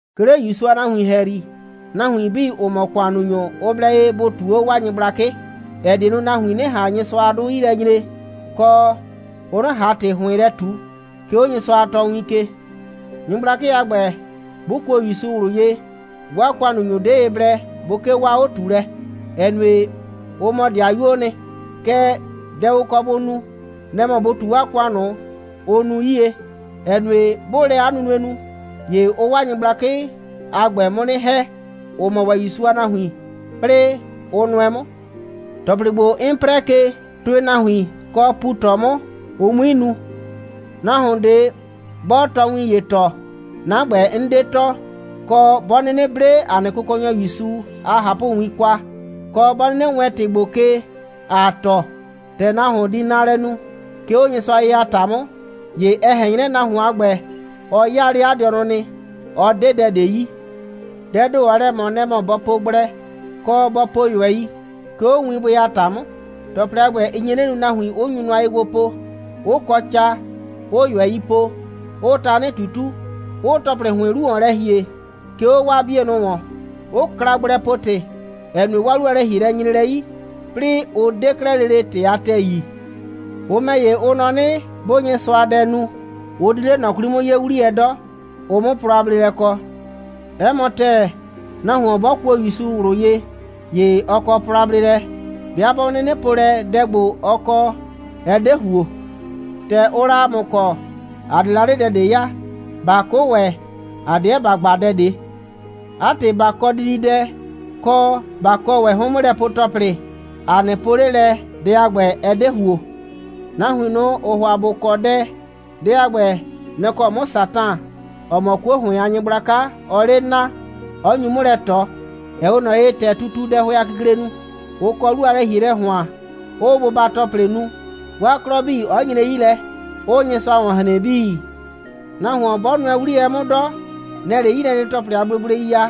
'Ke 'le ‑Yusu a nahuin ‑hɛyri, nahuin 'bii, ‑ʋ mɔ ‑kʋannunyʋ, ʋ blɛ ye bʋ ꞊tuu 'o 'waa nyɩgblakɩ, ‑ɛ die nu, nahuin 'nɩ ꞊han Nyɩsʋa a 'dʋ 'yi lɛ nyre, kɔ, ʋ 'nɩ ꞊han ‑tɩ ‑hʋɩn lɛ ꞊tu, 'ke 'o Nyɩsʋa a tɔɔwin ke. Nyɩgblakɩ a ‑gbɛ, 'bʋ kuo ‑Yusu ꞊wlʋ ye, 'waa ‑kʋannunyʋ 'de ye blɛ bʋ 'kee 'waa 'o꞊tuulɛ, ‑ɛ nue, ʋ mɔ 'dɩayuoo nɩ. Kɛɛ, dɛ ʋ kɔ bʋ nu, nɛ‑ mɔ bʋ ꞊tu 'waa ‑kʋan ꞊nʋ, ʋʋ nu 'yie, ‑ɛ nue, 'bʋʋ lɛ 'a nunue nu, ‑ye ʋʋ 'waa nyɩgblakɩ a ‑gbɛ 'mʋ 'nɩ ‑hɛ, ‑ʋ mɔ ‑wɛ ‑Yusu a nahuin, 'plɩɩ, ʋ nʋɛ 'mʋ. ‑Tɔplɩ ‑gbo, 'n 'prɛɛ ke, tʋɩ nahuin, kɔ, pu ꞊tɔ 'mʋ, ʋ 'mui nu. Nahuon ꞊de, 'bɔɔ tɔɔwin ‑ye tɔɔ, 'na ‑gbɛ, 'n 'de tɔɔ, kɔ, 'bɔ 'nɩnɩ 'ble ‑a nɩ Kʋkɔnyɔ ‑Yusu 'Klɩsʋ a ꞊hapʋwin kwa, kɔ, 'bɔ 'nɩnɩ wɛɛn ‑wɛ ‑tɩ ‑gbo ke, ‑aa tɔɔ, ‑tɛ nahuon di naalɛ nu, 'ke 'o Nyɩsʋa ye a ‑ta 'mʋ, ‑ye ɛ ꞊hɛn 'nyrɛ, nahuon a ‑gbɛ, ɔ 'yaa 'le 'a dɩɔnʋ nɩ. Ɔ 'de dɛ ꞊de yi. Dɛɛ ‑do, ɔɔ lɛ ꞊mɔ, nɛ‑ mɔ bɔ po gblɛ, kɔ, bɔ po ꞊yʋɛi, 'ke 'o winbʋɩ a ‑ta 'mʋ. ‑Tɔplɩ a ‑gbɛ, ɩ nye 'nɩ nu, nahuin, ‑ʋ nyu nʋa ye gbo po, 'ʋ kɔ ca, 'ʋʋ ꞊yʋɛi po, 'ʋʋ tanɩ ꞊tutu, 'ʋʋ ‑tɔplɩ ‑hʋɩn 'lu ‑wɔn lɛ ‑hie, 'ke 'o 'waa 'bienʋ ‑wɔn, 'ʋ kla gblɛpo‑tɩ, ‑ɛ nue, 'waa 'lu a lɛ‑hielɛ nyre lɛ 'yi, 'plɩɩ ʋ 'de 'klɛɛ lele ‑tɩ a ‑tɛɛ yi. Ʋ ‑mɛ ‑ye, ʋ nɔ 'nɩ, 'bʋʋ Nyɩsʋadɛ nu, ʋ di 'le ꞊nɔ 'kwli 'mʋ 'yee 'wliyɛ 'dɔ, ʋ 'mʋ plɔ a bleelɛ kɔ. 'Ɛ mɔ ‑tɛɛ, nahuon 'bɔ kuo ‑Yusu ꞊wlʋ ye, ‑ye ɔ kɔ plɔ a bleelɛ, 'bɩa 'bɔ 'nɩnɩ po lɛ, dɛ ‑gbo, ɔ kɔ, ɛ 'de ‑huo. ‑Tɛ ʋʋ la ‑a mʋ kɔ, ‑a 'de la 'le dɛ ꞊de ya. ꞊Ba 'kʋ ‑wɛ, ‑a 'deɛ ‑ba gba dɛ ꞊de. 'A ‑tɩ, ꞊ba kɔ dididɛ, kɔ, ꞊ba kɔ ‑wɛ 'hʋɩn'mʋlɛpue‑tɔplɩ, ‑a 'nɩ po 'le lɛ, dɛ a ‑gbɛ, ɛ 'de ‑huo. Nahuin ꞊nʋ, ‑ʋʋ ‑hʋa ‑bʋ kɔ dɛ, dɛ a ‑gbɛ, nɛ‑ kɔ 'mʋ Satan, ‑ɔ mɔ 'kuo ‑hʋɩn a nyɩgblaka, ɔɔ 'le naa, 'ɔ nyu 'mʋ lɛ ꞊tɔ, ‑ɛ 'we ꞊nɔ ye, ‑tɛ tutuu dɛhʋɛ a kikle nu, 'ʋ kɔ 'lu a lɛ‑hielɛ ‑hʋan, 'ʋʋ bʋba‑tɔplɩ nu, 'waa 'klɔ 'bii 'ɔ nyre 'yi lɛ, 'ʋʋ Nyɩsʋa ‑wɔn hren 'bii. Nahuon bɔ nʋɛ 'wliyɛ 'mʋ 'dɔ, nɛ‑ɛ 'le 'yilɛnyre‑tɔplɩ a gblegblei ya.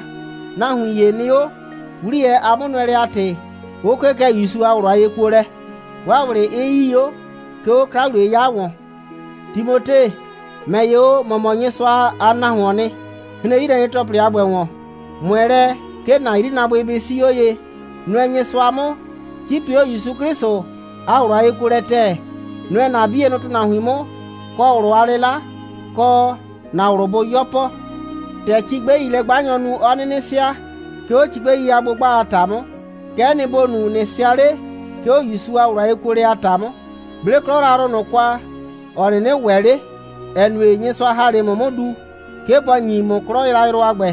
Nahuin ‑ye nɩ 'o, 'wliyɛ a 'mʋnʋɛlɛ a ‑tɩ, 'ʋ 'kee kɛ ‑Yusu a ꞊wlʋ a yekuolɛ, 'waa ꞊wlɩ 'ɩ 'yii 'o, 'ke 'o 'kla‑wliye'yɩya ‑wɔn. Timote, ‑mɛ ‑ye o, ‑mɔ mɔ Nyɩsʋa a nahuoon nɩ. Hren 'yilɛnyre‑tɔplɩ 'bii a ‑gbɛ ‑wɔn. ꞊Mʋɛ lɛ, 'ke ‑na 'yrinaabʋɩ bɩ 'sii 'o ye. Nʋɛ Nyɩsʋa 'mʋ, 'cipi 'o ‑Yusu 'Klɩsʋ a ꞊wlʋ a yekuolɛ ‑tɛɛ. Nʋɛ ‑na 'bienʋ ‑tʋnahuin 'mʋ. Kɔ ꞊wlʋ a 'lɩla, kɔ ‑na ꞊wlʋ bʋ 'yɔpɔ. ‑Tɛ cigbɛilɛ'gbanyɔɔ nu, 'ɔ 'nɩnɩ sɩa, 'ke 'o cigbɛi a 'gbʋgba a ‑ta 'mʋ, kɛ'ɛ nɩ, ‑bo nu, ꞊nɩ sɩa 'le, 'ke 'o ‑Yusu a ꞊wlʋ a yekuolɛ a ‑ta 'mʋ. 'Ble 'klɔ yrayrʋ ꞊nʋ kwa, ‑ɔ 'nɩnɩ ‑wɛ 'le, ‑ɛ nue, Nyɩsʋa ‑ha 'le ‑mʋ 'mʋ du, 'ke bɔ ‑nyi ‑mʋ 'klɔ yrayrʋ a ‑gbɛ.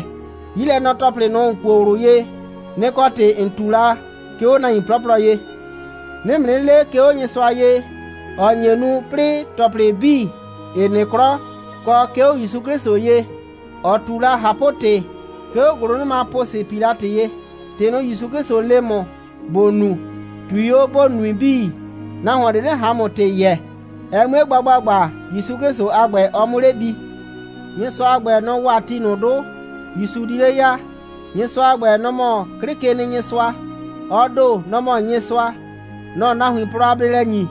'Yilɛnɔ‑tɔplɩ ꞊nʋ, ‑n kuo ꞊wlʋ ye, nɩ‑ kɔ ‑tɩ ‑n ꞊tu la, 'ke 'o nahuin 'plɔplɔ ye. 'Nɩɩ ‑mʋ 'nɩ le, 'ke 'o Nyɩsʋa ye, ‑ɔ nye nu, 'plɩɩ ‑tɔplɩ 'bii 'ɩ nɩ 'klɔ, kɔ 'ke 'o ‑Yusu 'Klɩsʋ ye, ‑ɔ ꞊tu la ꞊hapʋ‑tɩ, 'ke 'o ‑gʋlʋnʋma Pʋsɩ Pilatɩ ye, ‑tɩ ꞊nʋ, ‑Yusu 'Klɩsʋ le ‑mʋ, ‑bo nu, ꞊tui 'o, ‑bo nui 'bii, nahuon ꞊de 'nɩ ꞊han ‑mʋ ‑tɩ yɛɛ, ɛ 'mue gba ‑gbagba, ‑Yusu 'Klɩsʋ a ‑gbɛ, ɔ 'mʋ 'le di. Nyɩsʋa a ‑gbɛ, nɔ‑ wa ti ꞊nʋ 'dʋ, ‑Yusu di 'le ya. Nyɩsʋa a ‑gbɛ, nɔ‑ mɔ 'Klɩkenɩnyɩsʋa. Ɔ ‑do, nɔ‑ mɔ Nyɩsʋa. Nɔ‑ɔ nahuin plɔ a bleelɛ ‑nyi.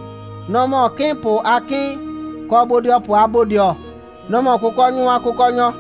Nɔ‑ mɔ 'kɩɩnpʋ a 'Kɩɩn, kɔ bodɩɔpʋ a Bodɩɔ. Nɔ‑ mɔ kʋkɔnyʋ a Kʋkɔnyɔ.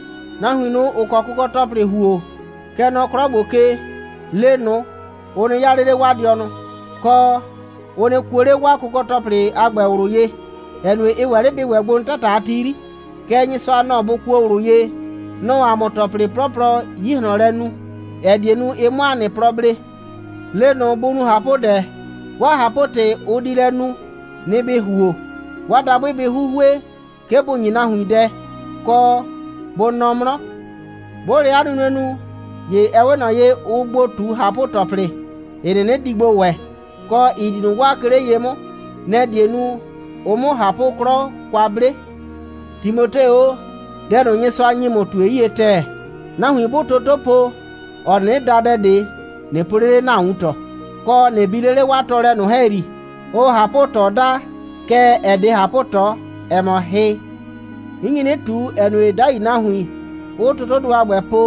Nahuin ꞊nʋ, ‑ʋ kɔ kʋkɔ‑tɔplɩ ‑huo, kɛ nɔ 'klɔ ‑gbo ke, le ꞊nʋ, ʋ nɩ 'yaa 'le 'le 'waa dɩɔnʋ, kɔ, ʋ nɩ kuo 'le 'waa kʋkɔ‑tɔplɩ a ‑gbɛ ꞊wlʋ ye, ‑ɛ nue, ɩ ‑wɛ 'le bɩ ‑wɛ gbo nɩ 'tata a ti 'yri. Kɛɛ, Nyɩsʋa, nɔ‑ bʋ kuo ꞊wlʋ ye. Nɔ‑ɔ ‑a mʋ ‑tɔplɩ 'plɔplɔ 'yi ꞊hlɔn lɛ nu, ‑ɛ die nu, ɩ 'mʋ ‑a nɩ plɔ blee. Le ꞊nʋ, bʋ nu ꞊hapʋdɛ. 'Waa ꞊hapʋ‑tɩ, ʋ di lɛ nu, nɩ‑ ‑bɩ ‑huo. 'Waa dabʋɩ bɩ 'huhue, 'ke bʋ ‑nyi nahuin dɛ, kɔ, bʋ nɔ 'mlɔ. 'Bʋʋ lɛ 'a nunue nu, ‑ye ɛ 'we ꞊nɔ ye, ʋʋ gbo ꞊tu ꞊hapʋ‑tɔplɩ, ‑ɩ 'nɩnɩ di gbo ‑wɛ, kɔ, ‑ɩ di ꞊nʋ waa, 'ke 'le ye 'mʋ. Nɛ‑ die nu, ʋ 'mʋ ꞊hapʋ'klɔ kwa 'ble. Timote o, dɛ ꞊nʋ, Nyɩsʋa ‑nyi ‑mʋ, ꞊tue 'yie ‑tɛɛ. Nahuin 'bʋʋ toto po, ‑ɔ 'nɩnɩ da dɛ ꞊de, ꞊nɩ po 'le 'le ‑na wuntɔ, kɔ, ꞊nɩ bi 'le 'le 'waa tɔɔlɛ ꞊nʋ ‑hɛyri, ʋʋ ꞊hapʋ꞊tɔ daa. Kɛɛ, ɛ 'de ꞊hapʋ꞊tɔ. Ɛ mɔ hɩ. 'N nyi 'nɩ ꞊tu, ‑ɛ nue, 'dai nahuin, ‑ʋʋ totodʋ a ‑gbɛ po,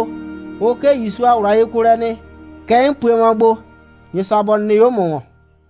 ʋ 'kee ‑Yusu a ꞊wlʋ a yekuolɛ nɩ. Kɛ 'n pue mɔ gbo. Nyɩsʋa bɔ nɩ 'o 'a mʋ ‑wɔn.